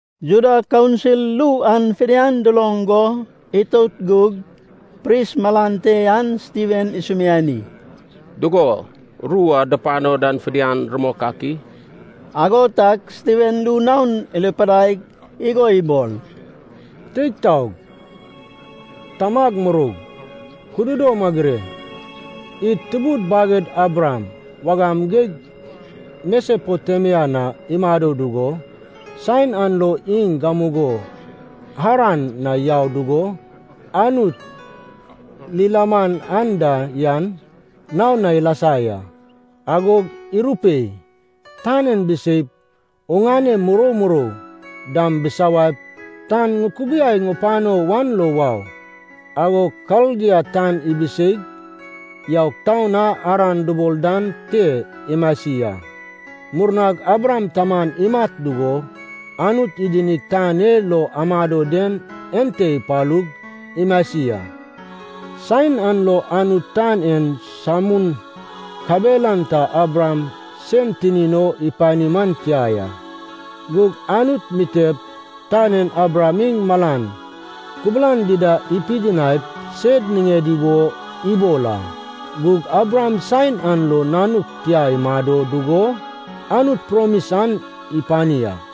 Juda Kaunsil ru an fidian duloŋ go itout gug pris malan te an Stiven isumiani, “Dugo, ru a dupano dan fidian rumok ak i?” Ago tag Stiven ru naon irupidaig igo ibol, “Teig taog, tamag muroug, kududom agure! Id tubud baged Abraham wagam geig Mesopotemia na imado dugo, saen an lo iŋ gamugo Haran na yau dugo, Anut lilaman anda yan naon na ilasa ya. Agog irupei, ‘Tan en biseip, oŋane murou murou dam busawaip tan ŋukubiai pano wan lo wau.’ Agog Kaldia tan ibiseig yaug taun a Haran dubol dan te imasi a. Murnag Abraham taman imat dugo Anut idinig tan e lo amado den ente ipalug, imasi a. Saen an lo Anut tan en samun kabelan ta Abraham sen tinin o ipani man tia ya. Gug Anut mitep tan en Abraham iŋ malan kubulan dida ipidinaip sed niŋedi wo ibol a. Gug Abraham saen an lo nanuk tia imado dugo Anut promis an ipani a.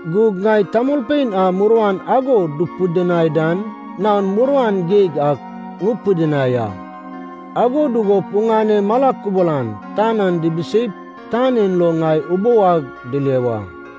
Gug ŋai tamolpein a muruan ago dupidinai dan naon muruan geig ak ŋupidinai a. Ago dugup oŋane mala kubulan tan an dibiseip, tan en lo ŋai ubou ag dile wa.’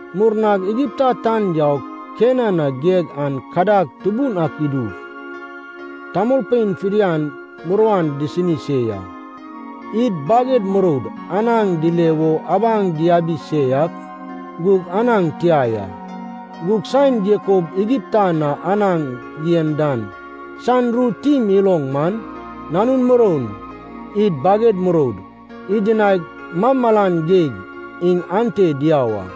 “Murnag Igipta tan yaug Kenan na geg an kadag tubun ak idug, tamolpein fidian muruan disini se ya. Id baged muroud anaŋ dile wo abaŋ diabi se ak gug anaŋ tia ya. Gug saen Jakob Igipta na anaŋ yen dan san ru tim iloŋ man, nanun muroun, id baged muroud, idinaig malmalan geig iŋ atna diau a.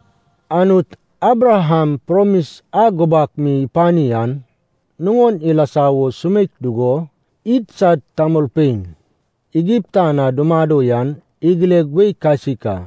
“Anut Abraham promis a gubak mi ipani an nuŋon ilasa wo sumeik dugo, idsad tamolpein Igipta na dumado yan igileg wei kasik a.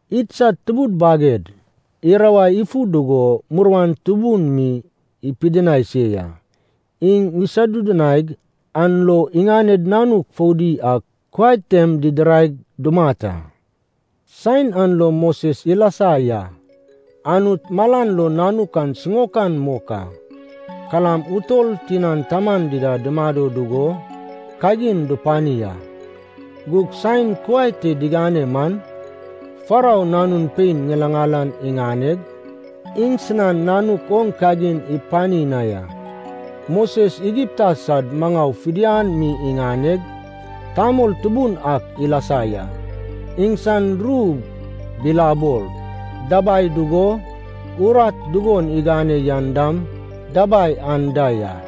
Idsad tubud baged irawai ifu dugo, muruan tubun mi ipidinai se ya. Iŋ isodudunaig an lo iŋaned nanuk foudi ak kuai tem didiraig, dumat a. “Saen an lo Moses ilasa ya. Anut malan lo nanuk an siŋaokan mok a. Kalam utol tinan taman dida dumado dugo kagin dupani a. Gug saen kuai te digane man, Farou nanun pein ŋilaŋal an iŋaneg, iŋsinan nanuk oŋ kagin ipani na ya. Moses Igipta sad maŋau fidian mi iŋaneg, tamol tubun ak ilasa ya. Iŋsan ru bilabol dabai dugo, urat dugon igane yan dam dabai anda ya.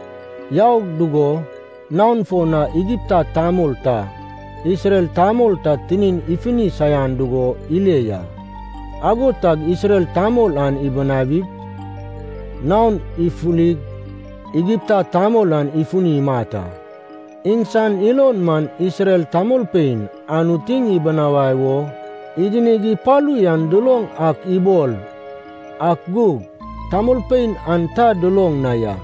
Yau dugo naon fo na Igipta tamol ta Isrel tamol ta tinin ifini saian dugo ile ya. Ago tag Isrel tamol an ibinawig, naon ifulig Igipta tamol an ifuni imat a. Iŋsan ilon man, Isrel tamolpein Anut iŋ ibinawai o idinig ipalu yan duloŋ ak ibol, ak gug tamolpein an ta duloŋ na ya.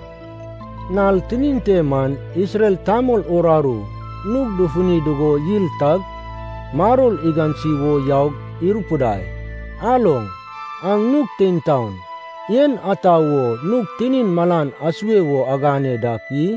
Nal tinin te man, Isrel tamol uraru nug dufuni dugo yil tag, maror igansi wo yaug irupidai, ‘Aloŋ, aŋ nug tein taon, en ata wo nug tinin malan asue wo agane dak i?’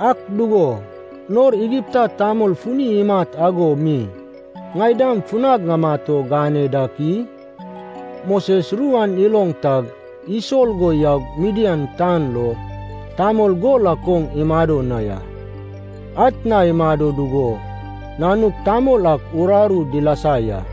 Ak dugo, nor Igipta tamol funi imat ago mi ŋai dam funag ŋamat o gane dak i?’ Moses ru an iloŋ tag isol go yaug Midian tan lo tamol gol ak oŋ imado na ya. Atna imado dugo nanuk tamol ak uraru dilasa ya.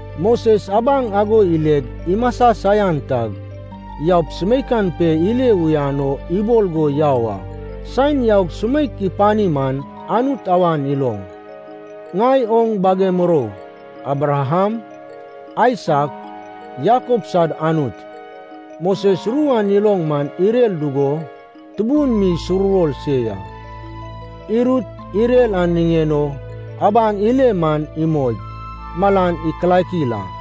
Moses abaŋ ago ileg imasa saian tag, yaup sumeikan pe ile uyan o ibol go yau a. Saen yaug sumeik ipani man, Anut awan iloŋ, ‘Ŋai oŋ bage murou Abraham, Aisak, Jakob sad Anut.’ Moses ru an iloŋ man irer dugo tubun mi isuruwor se ya. Irut irer an niŋen o abaŋ ile man imoig, malan ikilakil a.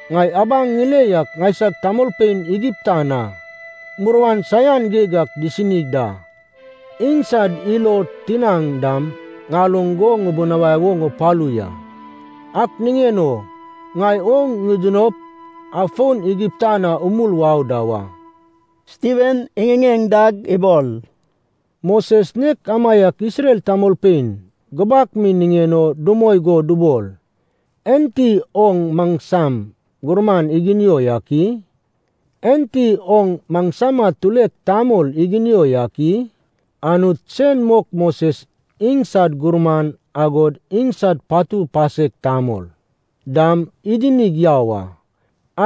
Ŋai abaŋ ŋile yak ŋaisag tamolpein Igipta na muruan saian geig ak disini da. Iŋsad ilo tinaŋ dam ŋaloŋ go ŋubunawai o ŋupalu ya. Ak niŋen o ŋai oŋ ŋidinop afon Igipta na umul wau da wa.’” Stiven iŋiŋeŋ dag ibol, “Moses nek amaiak Isrel tamolpein gubak mi niŋen o dumoi go dubol, ‘Enti oŋ maŋsam gurman iginio yak i? Enti oŋ maŋsama tulek tamol iginio yak i?’ Anut sen mok Moses iŋsad gurman, agod iŋsad patu pasek tamol dam idinig yau a.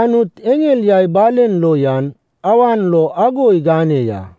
Anut eŋel yai balen lo yan awan lo ago igane ya.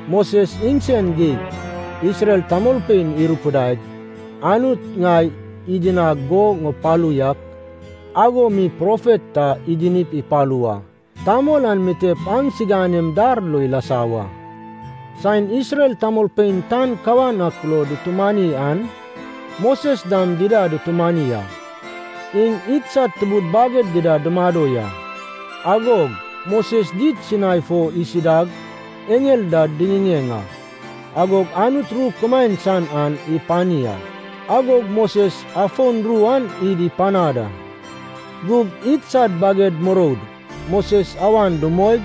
Moses iŋsen geig Isrel tamolpein irupidai, ‘Anut ŋai idinag go ŋupalu yak ago mi profet ta idinip ipalu wa. Tamol an mitep aŋsiganem dar lo ilasa wa.’ Saen Isrel tamolpein tan kawan ak lo dutumani an, Moses dam dida dutumani a. Iŋ idsad tubud baged dida dumado ya. Agog Moses did Sinai fo isidag, eŋel da diŋiŋeŋ a. Agog Anut ru kumaen san an ipani a, agog Moses afon ru an id ipanad a. “Gug idsad baged muroud Moses awan dumoig,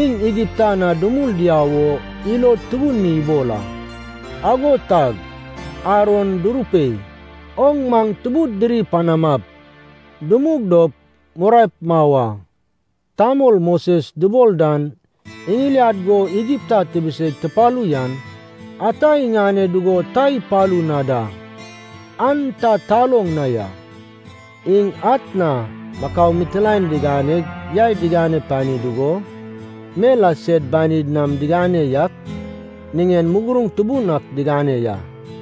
iŋ Igipta na dumul diau wo ilod tubun mi ibol a. Ago tag Aron durupei, ‘Oŋ maŋ tubud diri panamap, dumug dop muraep mau a. Tamol Moses dubol dan iŋiliad go Igipta tibiseig tupalu yan, ata iŋane dugo ta ipalu na da, an ta taloŋ na ya.’ Iŋ atna makau mitilaen diganeg yai digane pani dugo, mel a sed banid nam digane yak niŋen muguruŋ tubun ak digane ya.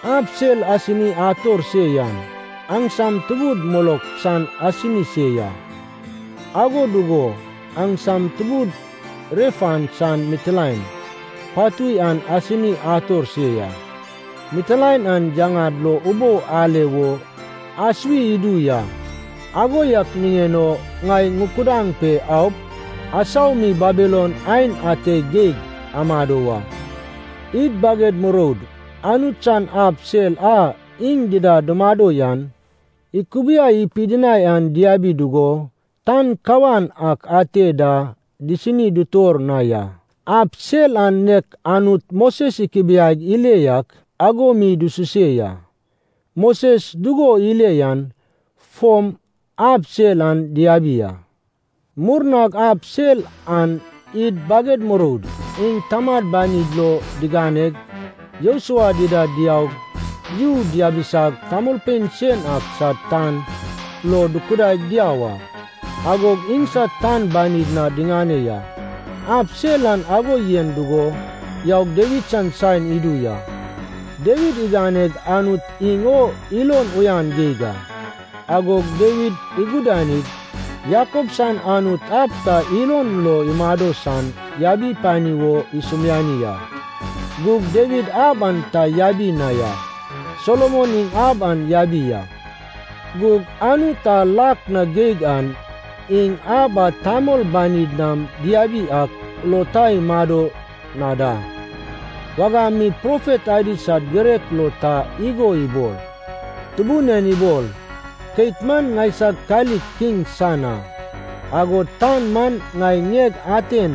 Ab sel asini ator se yan aŋsam tubud Molok san asini se ya. Ago dugo aŋsam tubud Refan san mitilaen patui an asini ator se ya. Mitilaen an yaŋad lo ubou ale wo asuwi idu ya. Ago yak niŋen o ŋai ŋukudaŋ pe aup, asau mi Babilon aen ate geig amado wa.’ “Id baged muroud Anut san ab sel a iŋ dida dumado yan ikubiai pidinai an diabi dugo, tan kawan ak ate da disini dutor na ya. Ab sel an nek Anut Moses ikubiaig ile yak ago mi dususe ya, Moses dugon ile yan fom ab sel an diabi a. Murnag ab sel an id baged muroud iŋ tamad banid lo diŋaneg, Josua dida diaug yu diabisag tamolpein sen ak sad tan lo dukudaig diau a. Agog iŋsad tan banid na diŋane ya. Ab sel an ago yen dugo yaug Dawid san saen idu ya. Dawid iganeg Anut iŋ o ilon uyan geig a. Agog Dawid igudanig, Jakob san Anut ab ta ilon lo imado san yabi pani wo isumiani a. Gug Dawid ab an ta yabi na ya. Solomon iŋ ab an yabi a. “Gug Anut a lak na geig an, iŋ ab a tamol banid nam diabi ak lo ta imado na da. Wagam mi profet adi sad girek lo ta igo ibol, ‘Tubun en ibol, keit man ŋaisag kalik kiŋ san a, agod tan man ŋai ŋieg aten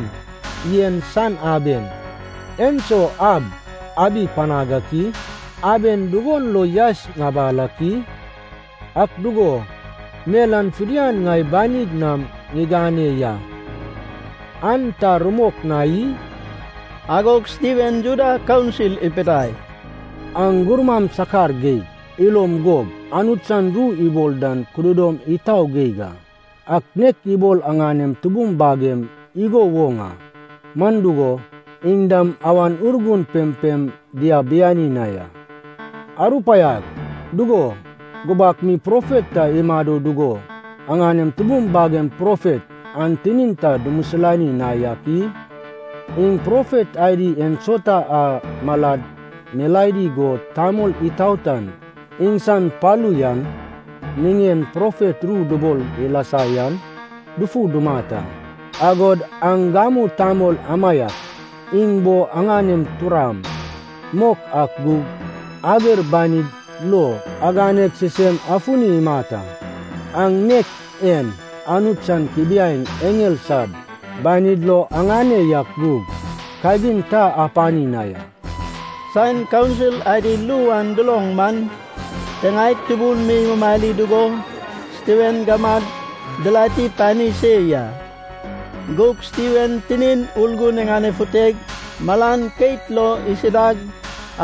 yen san aben. Enso ab abi panag ak i? Aben dugon lo yaes ŋabal ak i? Ak dugo, mel an fidian ŋai banig nam ŋigane ya, an ta rumok na i?’” Agog Stiven Juda Kaunsil ipidai, “Aŋ gurmam sakar geig. Ilom gob. Anut san ru ibol dan kududom itau geig a. Aŋ nek ibol aŋanem tubum bagem igo woŋ a, man dugo, iŋ dam Awan Urgun pempem diabiani na ya. Arupaiag, dugo, gubak mi profet ta imado dugo aŋanem tubum bagem profet an tinin ta dumisilani na yak i? Iŋ profet adi ensauta a malad milaedi go Tamol Itaotan iŋsan palu yan niŋen profet ru dubol ilasa yan dufu dumat a. Agod aŋ gamu tamol amaiak iŋ bo aŋanem turam mok ak gug ager banid lo aganeg sisem afuni imat a. Aŋ nek en, Anut san kubiaeŋ eŋel sad banid lo aŋane yak gug kagin ta apani na ya.” Saen kaunsil adi ru an duloŋ man, tiŋaed tubun mi imumari dugo Stiven gamad dirati pani se ya. Gug Stiven tinin Urgun iŋanefuteg malan keit lo isidag,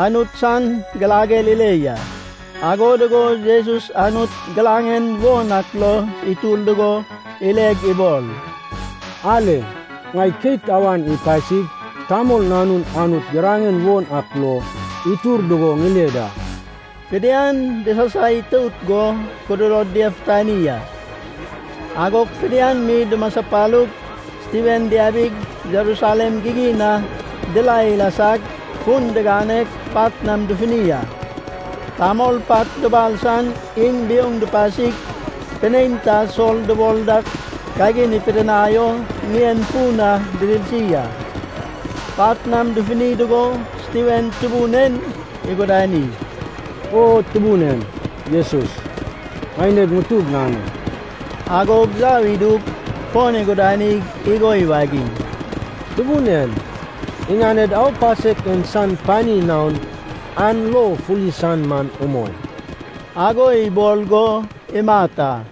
Anut san girager ile ya. Ago dugo Jesus Anut giraŋen won ak lo itur dugo ileg ibol, “Ale. Ŋai keit awan ipasig Tamol Nanun Anut giraŋen won ak lo itur dugo ŋile da.” Fidian disasaitout go kududod diafutani a. Agog fidian mi dumaspalug, Stiven diabig Jerusalem gigin na dirae dilasag, fun diganeg pat nam dufuni a. Tamol pat dubal san iŋ biouŋ dupasig pinein ta Sol dubol dak kagin ipidinai o ŋien fun na didirsi a. Pat nam dufuni dugo, Stiven Tubun en igudani, “O Tubun en Jesus, ŋaineg ŋutug ŋane!” Agog yau idug fon igudanig igo iwagiŋ, “Tubun en, iŋaned aupasek en san pani naon aŋ lo fuli san man umoi.” Ago ibol go imat a.